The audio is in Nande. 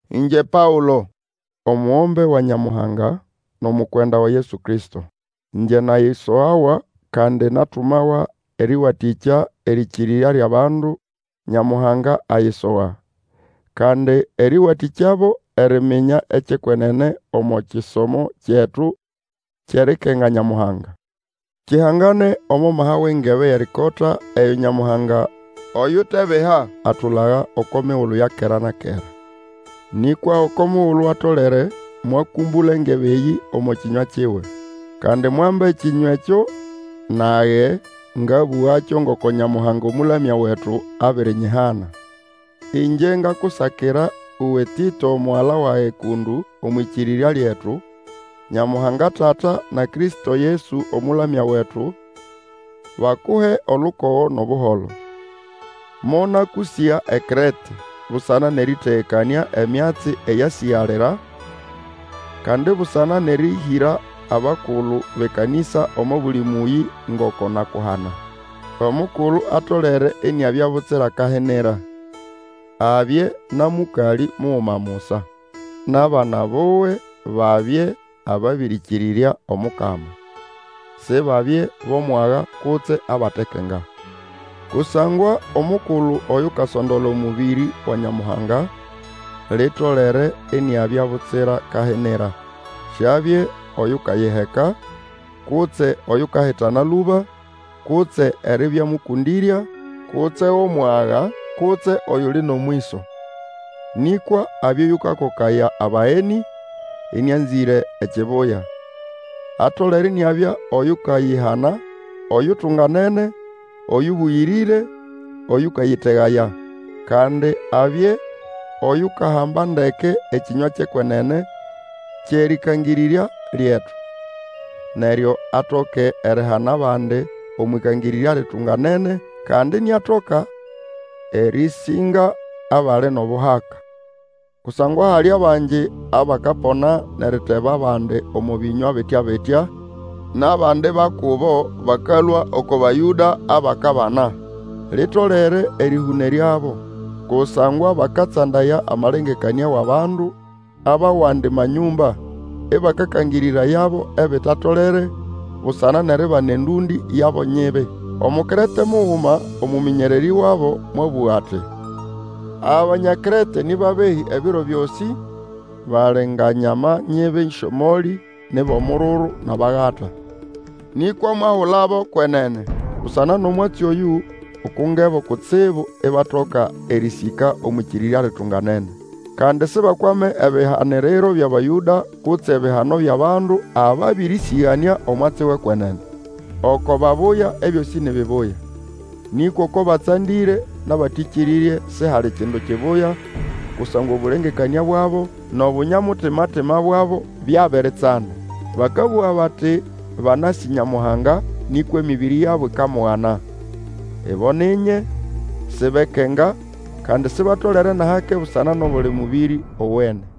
Ĩngye Paũlo, omugombe wa Nyamuhanga, nʼomukwenda wa Yesu Kristo, Ĩngye nayisogawa, kandi natumawa erĩwatĩkya erĩkĩrĩrya lyʼabandu Nyamuhanga ayisoga. Kandi erĩwatĩkyabo eriminya ekyʼekwenene omo kisomo kyetu kyʼerikenga Nyamuhanga. Kihangane omo maha wʼengebe yʼerikota eyo Nyamuhanga oyutebiha atulaga oko migulu ya kera-kera. Nĩkwa oko mugulu atolere mwakũmbũla engebe eyĩ omo kĩnywa kiwe. Kandi mwamba ekĩnywa ekyo, nage ngabũgakyo ngoko Nyamuhanga Omũlamya wetu abirinyihana. Ĩngye ngakusakira uwe Tĩto, omugala wage kũndũ omwʼĩkĩrĩrya lyetu; Nyamuhanga Tata, na Kristo Yesu Omũlamya wetu, bakuhe olukogo nʼobuholo. Monakũsĩga eKrete busana nʼerĩtegekanĩa emyatsi eyasĩgalira, kandi busana nʼerĩhĩra abakulu bʼekanisa omo buli mũyĩ, ngoko nakuhana. Omukulu atolere iniabya butsira kahinira, abye na mũkalĩ muguma musa, nʼabana buwe babye ababĩrĩkĩrĩrya Omukama, Sibabye bʼomwaga kutse abatekenga. Kusangwa omukulu Oyukasondola omũbĩrĩ wa Nyamuhanga, litolere iniabya butsira kahinira. Siabye oyukayiheka, kutse oyukahitana lũba, kutse eribya mũkũndĩrya, kutse wʼomwaga, kutse oyuli nʼomwĩso. Nĩkwa abye oyũkakokaya abagenĩ, ĩnĩanzĩre ekibuya. Atolere iniabya oyukayihana, oyutunganene, oyũbũyĩrĩre, oyũkayĩtegaya. Kandi abye Oyukahamba ndeke ekĩnywa kyʼekwenene, kyʼerĩkangĩrĩrya lyetu. Neryo atoke erihana abandi omwʼikangĩrĩrya litunganene, kandi iniatoka erĩsĩnga abali nʼobuhaka. Kusangwa hali bangi abakapona nʼeriteba abandi omo bĩnywa bitya-bitya, nʼabandi ba kubo bakalũa oko Bayũda abakabana. Litolere erĩhũneryabo, kusangwa bakatsandaya amalengekanĩa wʼabandu abʼawandi manyũmba, ĩbakakangĩrĩrayabo ebitatolere, busana nʼeribana endũndĩ yabo nyibi. Omukrete muguma, omũmĩnyererĩ wabo, mwabũga ati, Abanya Krete nĩ babehĩ ebiro byosĩ, bali nga nyama nyibi syʼomolĩ, ni bʼomururu, nʼabagata. Nĩkwa mwahulabo kwenene. Busana nʼomwatsi oyũ, ukungebo kutsibu, ibatoka erĩsĩka omwʼĩkĩrĩrya litunganene. Kandi Sibakwame ebihaniriro byʼAbayũda, kutse ebihano byʼabandu ababĩrĩsĩganĩa omwatsi wʼe kwenene. Oko babuya, ebyosĩ ni bibuya. Nĩkwa oko batsandĩre nʼabatĩkĩrĩrye, sihali kindu kibuya, kusangwa obũlengekania bwabo nʼobunya-mutima bwabo byabiritsanda. Bakabũga bati banasĩ Nyamuhanga, nĩkwa emĩbĩrĩ yabo ikamugana. Ibo ni nye, sibekenga, kandi sibatolere nʼahake busana nʼobuli mũbĩrĩ owene.